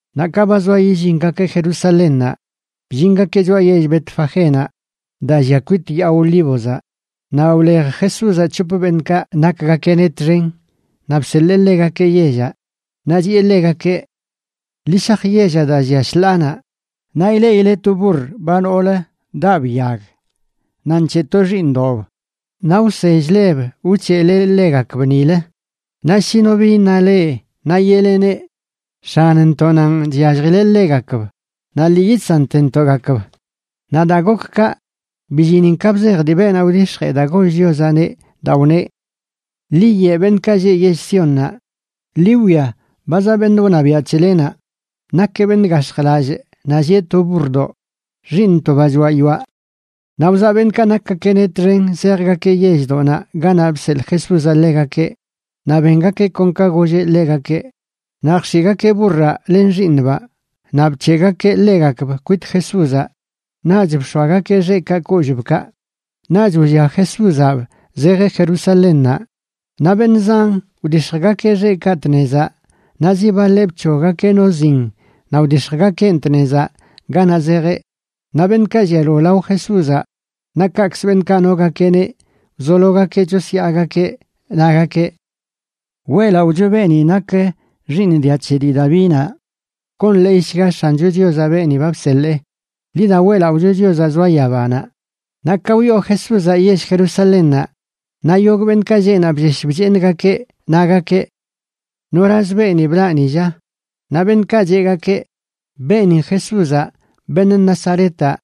Naꞌ ka ba zoa yillingakeꞌ Jerusalénnaꞌ, bllingakeꞌ choꞌa yell Betfagénaꞌ daa llia kwit Yaa Olívozaꞌ. Naꞌ wlej Jesúzaꞌ c̱hop beṉꞌkaꞌ nakgakeꞌneꞌ txen naꞌ bseḻee ḻegakeꞌ yellaꞌ. Naꞌ chiꞌe ḻegakeꞌ: ―Ḻi shaj yellaꞌ daa llia shḻaanaꞌ. Naꞌ ileꞌile to burr ba noolə daꞌb yag naꞌ nc̱heꞌ to xiiṉdoꞌb. Naꞌ wsell-leb wc̱heꞌlegakb nilə. Naꞌ shi no bi iṉa leꞌ, naꞌ yeꞌleneꞌ: “X̱anntoꞌnanꞌ chyalljileꞌ ḻegakb, naꞌ lii yidsantentoꞌgakb.” Naꞌ daa gok kaꞌ, billinin ka bzej dii beenaꞌ wdix̱jee daa goll Chiozaꞌneꞌ daa wneꞌ: Ḻi yeꞌ beṉꞌkaꞌ lleꞌ yell Siónnaꞌ: “Ḻi wwia, ba zaꞌ beṉꞌ wṉabiaꞌ c̱helenaꞌ, nakeꞌ beṉꞌ gax̱jlallꞌ naꞌ llieꞌ to burrdoꞌ; xiiṉ to ba choaꞌ yoaꞌ.” Naꞌ wzaꞌ beṉꞌkaꞌ nakgakeꞌneꞌ txen zejgakeꞌ yelldoꞌnaꞌ ganaꞌ bseḻꞌ Jesúzaꞌ ḻegakeꞌ naꞌ bengakeꞌ kon ka golleꞌ ḻegakeꞌ. Naꞌ jx̱iꞌgakeꞌ burraꞌ len xiiṉbaꞌ naꞌ bc̱heꞌgakeꞌ ḻegakb kwit Jesúzaꞌ. Naꞌch bx̱oagakeꞌ xeꞌkaꞌ kollꞌbkaꞌ, naꞌch wllia Jesúzaꞌb zejeꞌ Jerusalénnaꞌ. Naꞌ beṉꞌ zan wdix̱jgakeꞌ xeꞌkaꞌ tnezaꞌ, naꞌ zi baḻeꞌ bc̱hoggakeꞌ no zin naꞌ wdix̱jgakeꞌn tnezaꞌ ganaꞌ zejeꞌ. Naꞌ beṉꞌkaꞌ llialo lao Jesúzaꞌ, naꞌ kaꞌkzə beṉꞌkaꞌ nogakeꞌneꞌ, wzologakeꞌ chosyaagakeꞌ, nagakeꞌ: ―¡Weꞌlaꞌocho beeni nak xiiṉ dia c̱he dii Davinaꞌ! ¡Gonḻeeyshga X̱ancho Chiozaꞌ beeni ba bseḻee! ¡Ḻi da weꞌlaꞌocho Chiozaꞌ zoa yabanaꞌ! Naꞌ ka wyoo Jesúzaꞌ yell Jerusalénnaꞌ, naꞌ yogꞌ beṉꞌkaꞌ lleꞌ naꞌ bllesh bcheeṉgakeꞌ, nagakeꞌ: ―¿Noraz beeni blaꞌ ni, lla? Naꞌ beṉꞌkaꞌ cheꞌgakeꞌ: ―Beenin Jesúzaꞌ beṉꞌ Nazaretaꞌ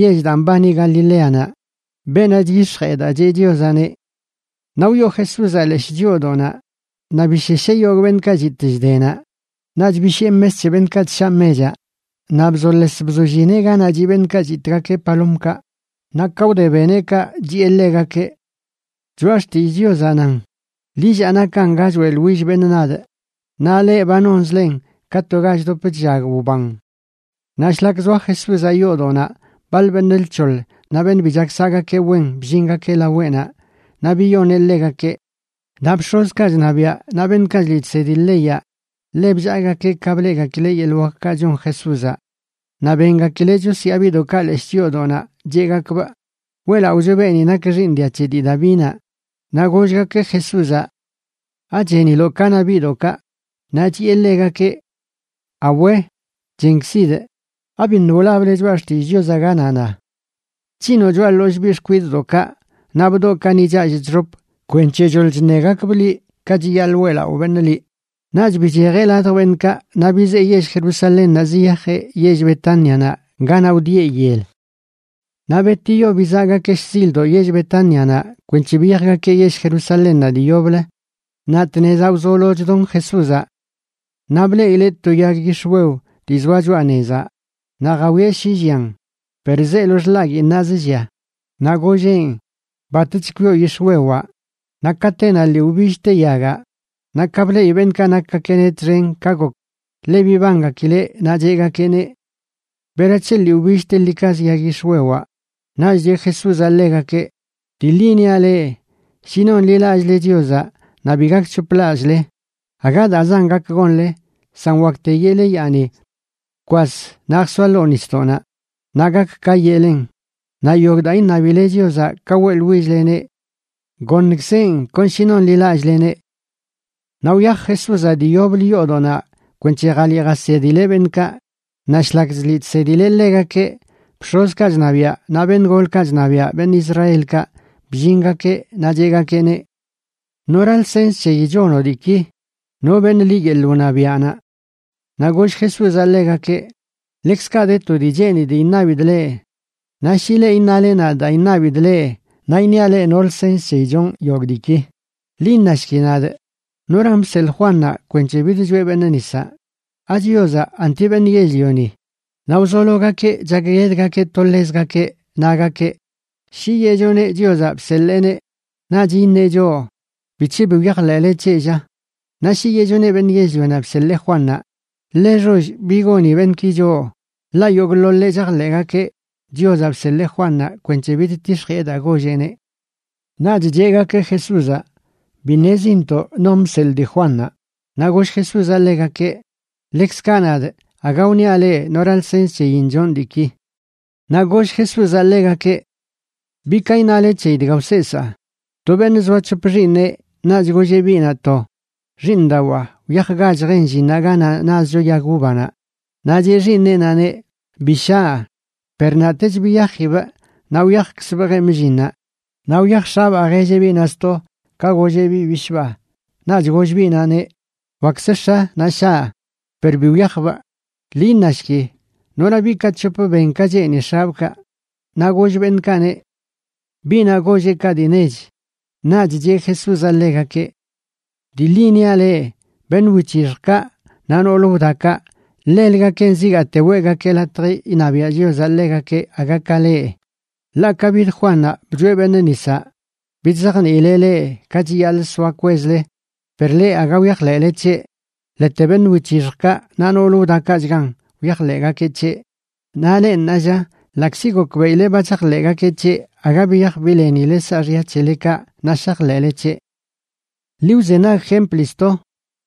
yell daa mbani Galileanaꞌ, beenaꞌ chyix̱jee daa cheꞌ Chiozaꞌneꞌ. Naꞌ wyoo Jesúzaꞌ leshꞌ chyoodoꞌnaꞌ naꞌ bishesheꞌ yogꞌ beṉꞌkaꞌ chitꞌ chde naꞌ. Naꞌch bishiꞌe mes c̱he beṉꞌkaꞌ chshaꞌ mechaꞌ naꞌ bzoles bzollineꞌ ganaꞌ chiꞌ beṉꞌkaꞌ chitꞌgakeꞌ palomkaꞌ. Naꞌ ka wde beneꞌ kaꞌ chiꞌe ḻegakeꞌ: ―Choꞌa xtillꞌ Chiozaꞌ nan: “Lillaa nakan ga choeꞌḻwill beṉꞌ nadꞌ”, naꞌ leꞌ, ba nonzlen ka to ga chdop chllag wban. Naꞌ shlak zoa Jesúzaꞌ yoodoꞌnaꞌ, baḻ beṉꞌ lc̱hoḻ naꞌ beṉꞌ bi chak saꞌgakeꞌ wen bllingakeꞌ laweꞌnaꞌ, naꞌ biyoneꞌ ḻegakeꞌ. Naꞌ bx̱ozkaꞌ chṉabiaꞌ naꞌ beṉꞌkaꞌ chliꞌ chsedi leyaꞌ ḻe bllaagakeꞌ ka bleꞌgakileꞌ yeḻꞌ wakkaꞌ chon Jesúzaꞌ, naꞌ bengakileꞌ chosyaa biꞌdoꞌkaꞌ leshꞌ chyoodoꞌnaꞌ, cheꞌgakbꞌ: “¡Weꞌlaꞌocho beeni nak xiiṉ dia c̱he dii Davinaꞌ!” Naꞌ gollgakeꞌ Jesúzaꞌ: ―¿Acheniloꞌ ka na biꞌdoꞌkaꞌ? Naꞌ chiꞌe ḻegakeꞌ: ―Awe, chenkzidꞌ. ¿Abiṉꞌ wlable Choꞌa Xtillꞌ Chiozaꞌ ganaꞌ na: Chc̱hinoꞌ choꞌa ḻollꞌ biꞌ xkwidꞌdoꞌkaꞌ naꞌ bdoꞌkaꞌ ni challꞌ chxop kwenc̱he choḻ chṉegakbꞌ liꞌ ka chiyaḻꞌ weꞌlaꞌo beṉꞌ liꞌ? Naꞌch bichejeꞌ ladj beṉꞌkaꞌ, naꞌ bizee yell Jerusalénnaꞌ ziyajeꞌ yell Betánianaꞌ ganaꞌ wdieꞌ yel. Naꞌ betiyo bizaꞌgakeꞌ shzildoꞌ yell Betánianaꞌ kwenc̱he biyajgakeꞌ yell Jerusalénnaꞌ dii yoblə, naꞌ tnezaꞌ wzolo chdon Jesúzaꞌ. Naꞌ bleꞌileꞌ to yag yix̱wew dii zoa choꞌa nezaꞌ, naꞌ jawieꞌ shi llian. Per zeelo xḻaguiinnaꞌz llia. Naꞌ golleꞌn: ―¡Batch kwioꞌ yix̱wewaꞌ! Naꞌ katenaꞌ lii wbillte yagaꞌ. Naꞌ ka bleꞌi beṉꞌkaꞌ nakgakeꞌneꞌ txen ka gok, ḻe bibangakileꞌ, naꞌ cheꞌgakeꞌneꞌ: ―¿Berac̱he lii wbilltelikazə yag yix̱wewaꞌ? Naꞌch cheꞌ Jesúzaꞌ ḻegakeꞌ: ―Dii ḻi niaꞌ leꞌ, shi nonḻilallꞌle Chiozaꞌ naꞌ bi gakc̱hoplallꞌle, aga daazan gak gonle, san wakte yeꞌle yaani: “Bkwas, naꞌ jsoa ḻoo nisdoꞌnaꞌ”, naꞌ gak ka yeꞌlen. Naꞌ yogꞌ daa iṉabile Chiozaꞌ ka weꞌḻwill-leneꞌ goṉkzeꞌn kon shi nonḻilallꞌleneꞌ. Naꞌ wyaj Jesúzaꞌ dii yoblə yoodoꞌnaꞌ kwenc̱he jaliꞌ jasedileꞌ beṉꞌkaꞌ. Naꞌ shlak chliꞌ chsedileꞌ ḻegakeꞌ, bx̱ozkaꞌ chṉabiaꞌ naꞌ beṉꞌ golkaꞌ chṉabiaꞌ beṉꞌ Israelkaꞌ bllingakeꞌ, naꞌ cheꞌgakeꞌneꞌ: ―¿Nora lsens c̱heyi chonoꞌ diiki? ¿No beṉ liꞌ yeḻꞌ wṉabiaꞌnaꞌ? Naꞌ goll Jesúzaꞌ ḻegakeꞌ: ―Ḻekzkaꞌ de to dii cheenidꞌ iṉabidꞌ leꞌ. Naꞌ shi leꞌ iṉale nadꞌ daa iṉabidꞌ leꞌ, naꞌ iṉiaꞌ leꞌ no lsens c̱heyi chonꞌ yogꞌ diiki. Ḻi iṉashki nadꞌ, ¿noran bseḻꞌ Juannaꞌ kwenc̱he bidchoeꞌ beṉꞌ nisaꞌ? ¿AChiozaꞌ anti beṉꞌ yell-lioni? Naꞌ wzologakeꞌ chakguedgakeꞌ to ḻezgakeꞌ, nagakeꞌ: ―Shi yeꞌchoneꞌ Chiozaꞌ bseḻeeneꞌ naꞌch iṉeꞌ choꞌ: “¿Bic̱he bi wyajḻeꞌle c̱heꞌ, lla?” Naꞌ shi yeꞌchoneꞌ beṉꞌ yell-lionaꞌ bseḻee Juannaꞌ, ḻe xoll bi goni beṉꞌki choꞌ, ḻaꞌ yogꞌḻoḻeꞌ chajḻeꞌgakeꞌ Chiozaꞌ bseḻee Juannaꞌ kwenc̱he bidtix̱jiꞌe daa golleꞌneꞌ. Naꞌch cheꞌgakeꞌ Jesúzaꞌ: ―Bi ṉezintoꞌ non bseḻꞌ dii Juannaꞌ. Naꞌ goll Jesúzaꞌ ḻegakeꞌ: ―Ḻekzkaꞌ nadꞌ, aga wniaꞌ leꞌ nora lsens c̱heyin chonꞌ diiki. Naꞌ goll Jesúzaꞌ ḻegakeꞌ: ―¿Bi ka iṉale c̱heyi dga wseesaa? To beṉꞌ zoa c̱hop xiiṉeꞌ, naꞌch golleꞌ biꞌnaꞌ to: “Xiiṉdawaa, wyajgach jen llinnaꞌ ganaꞌ nazcho yag uvanaꞌ.” Naꞌ cheꞌ xiiṉeꞌnaꞌneꞌ: “¡Bi shaꞌ!” Per naꞌtech biyajibꞌ naꞌ wyajkzbꞌ jemꞌ llinnaꞌ. Naꞌ wyaj x̱abaa jelleꞌ biꞌnaꞌ sto ka golleꞌ biꞌ bishꞌbaa, naꞌch goll biꞌnaꞌneꞌ: “Wakkzə x̱a, naꞌ shaꞌ.” Per bi wyajbꞌ. Ḻi iṉashki, ¿nora biꞌkaꞌ c̱hop ben ka cheeni x̱abꞌkaꞌ? Naꞌ goll beṉꞌkaꞌneꞌ: ―Biꞌnaꞌ golleꞌ kaꞌ dii nech. Naꞌch cheꞌ Jesúzaꞌ ḻegakeꞌ: ―Dii ḻi niaꞌ leꞌ, beṉꞌ wic̱hixjkaꞌ naꞌ noolə wdakaꞌ, ḻelgakenꞌ zigaate weꞌgakeꞌ latj iṉabiaꞌ Chiozaꞌ ḻegakeꞌ aga ka leꞌ. Ḻaꞌ ka bid Juannaꞌ bchoeꞌ beṉꞌ nisaꞌ, bidzajniileꞌ leꞌ ka chiyaḻꞌ soa kwezle, per leꞌ aga wyajḻeꞌle c̱heꞌ, ḻete beṉꞌ wic̱hixjkaꞌ naꞌ nool wdakaꞌchgan wyajḻeꞌgakeꞌ c̱heꞌ. Naꞌ leꞌ ṉaalla, ḻaꞌkzi gokbeꞌile ba chajḻeꞌgakeꞌ c̱heꞌ, aga biyaj bileni saaxya c̱helekaꞌ naꞌ shajḻeꞌle c̱heꞌ. ’Ḻi wzenag jempli sto.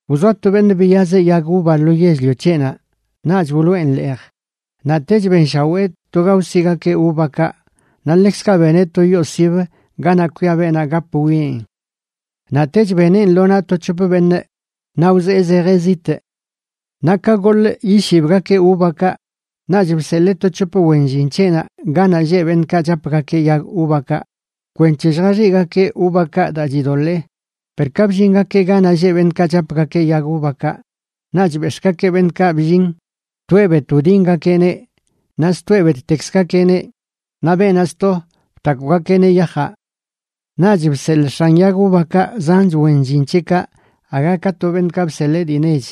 Wzoa to beṉꞌ biyazeꞌ yag uva lo yell-lio c̱heꞌnaꞌ naꞌch wloꞌen leej, naꞌtech benshawee to ga wsigakeꞌ uvakaꞌ. Naꞌ ḻekzkaꞌ beneꞌ to yoo sibə ganaꞌ kwia beenaꞌ gap wwieꞌn. ’Naꞌtech beneꞌn lo naꞌ to c̱hop beṉꞌ naꞌ wzee zejeꞌ zitꞌ. Naꞌ ka goḻꞌ yishibgakeꞌ uvakaꞌ, naꞌch bseḻee to c̱hop wen llin c̱heꞌnaꞌ ganaꞌ lleꞌ beṉꞌkaꞌ chapgakeꞌ yag uvakaꞌ kwenc̱he lljaxiꞌgakeꞌ uvakaꞌ daa chidoḻee. Per ka bllingakeꞌ ganaꞌ lleꞌ beṉꞌkaꞌ chapgakeꞌ yag uvakaꞌ, naꞌch bex̱ꞌgakeꞌ beṉꞌkaꞌ bllin, toeꞌ bet wdingakeꞌneꞌ, naꞌ stoeꞌ bettekzgakeꞌneꞌ naꞌ beenaꞌ sto btakwgakeꞌneꞌ yajaꞌ. Naꞌch bseḻꞌ x̱an yag uvakaꞌ zanch wen llin c̱heꞌkaꞌ aga ka to beṉꞌkaꞌ bseḻee dii nech,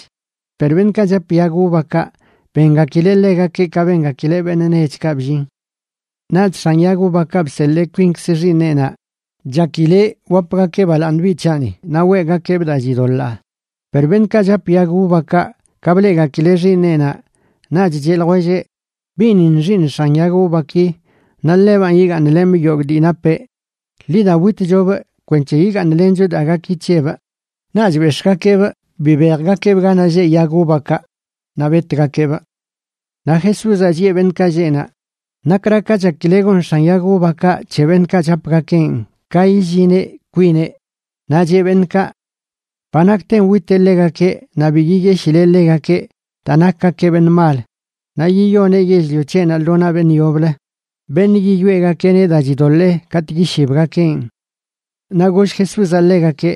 per beṉꞌkaꞌ chap yag uvakaꞌ bengakileꞌ ḻegakeꞌ ka bengakileꞌ beṉꞌ nechkaꞌ bllin. ’Naꞌch x̱an yag uvakaꞌ bseḻee kwinkz xiiṉeꞌnaꞌ, chakileꞌ: “Wapgakeꞌ balaaṉ biꞌ c̱haꞌni naꞌ weꞌgakeꞌbꞌ daa chidoḻaa.” Per beṉꞌkaꞌ chap yag uvakaꞌ ka bleꞌgakileꞌ xiiṉeꞌnaꞌ, naꞌch cheꞌ ljwelleꞌ: “Biꞌnin xiiṉ x̱an yag uvaki naꞌ ḻebanꞌ yigaaṉlemꞌ yogꞌ dii napeꞌ. Ḻi da witchobꞌ kwenc̱he yigaaṉlencho daa gaki c̱hebꞌ.” Naꞌch bex̱ꞌgakeꞌbꞌ bibejgakeꞌbꞌ ganaꞌ lleꞌ yag uvakaꞌ naꞌ betgakeꞌbꞌ. Naꞌ Jesúzaꞌ chiꞌe beṉꞌkaꞌ lleꞌ naꞌ: ―¿Nakra ka chakile gon x̱an yag uvakaꞌ c̱he beṉꞌkaꞌ chapgakeꞌn ka illineꞌ kwineꞌ? Naꞌ cheꞌ beṉꞌkaꞌ: ―Ba nakten witeꞌ ḻegakeꞌ naꞌ bi yiyeshileꞌ ḻegakeꞌ daa nakgakeꞌ beṉꞌ mal. Naꞌ yiyoneꞌ yell-lio c̱heꞌnaꞌ lo naꞌ beṉꞌ yoblə, beṉꞌ yiyoeꞌgakeꞌneꞌ daa chidoḻee katꞌ yishibgakeꞌn. Naꞌ goll Jesúzaꞌ ḻegakeꞌ: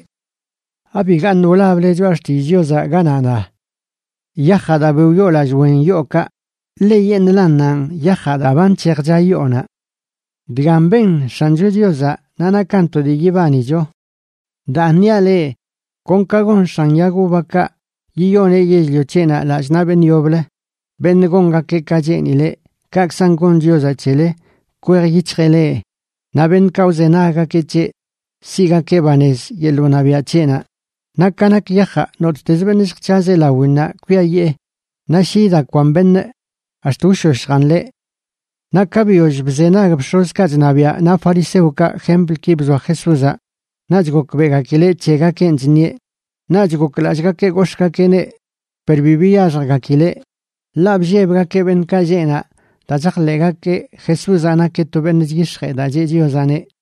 ―¿Abigaṉꞌ wlable Choꞌa Xtillꞌ Chiozaꞌ ganaꞌ na: Yajaꞌ daa bi wyoolallꞌ wen yookaꞌ, ḻeyeṉꞌlannanꞌ yajaꞌ daa ba nc̱hejcha yoonaꞌ. Dgan ben X̱ancho Chiozaꞌ naꞌ nakan to dii yibanicho? Daan niaꞌ leꞌ, kon ka gon x̱an yag uvakaꞌ yiyoneꞌ yell-lio c̱heꞌnaꞌ lallꞌ naꞌ beṉꞌ yoblə, beṉꞌ gongakeꞌ ka cheenileꞌ, kaꞌkzan gon Chiozaꞌ c̱hele. Kwej yic̱hjeꞌ leꞌ, naꞌ beṉꞌkaꞌ wzenaggakeꞌ c̱heꞌ, siꞌgakeꞌ banez yeḻꞌ wṉabiaꞌ c̱heꞌnaꞌ. Naꞌ ka nak yajaꞌ, nottezə beṉꞌ lljc̱hazeꞌ lawinnaꞌ kwiayee, naꞌ shi idakwan beṉꞌ, ax̱t wshoshjan ḻeꞌ. Naꞌ ka biyoll bzenag bx̱ozkaꞌ chṉabiaꞌ naꞌ fariseokaꞌ jemplki bzoa Jesúzaꞌ, naꞌch gokbeꞌgakileꞌ c̱hegakeꞌn chṉieꞌ. Naꞌch goklallꞌgakeꞌ gox̱ꞌgakeꞌneꞌ, per bi biyaxjgakileꞌ, ḻaꞌ bllebgakeꞌ beṉꞌkaꞌ lleꞌ naꞌ daa chajḻeꞌgakeꞌ Jesúzaꞌ nakeꞌ to beṉꞌ chyix̱jee daa cheꞌ Chiozaꞌneꞌ.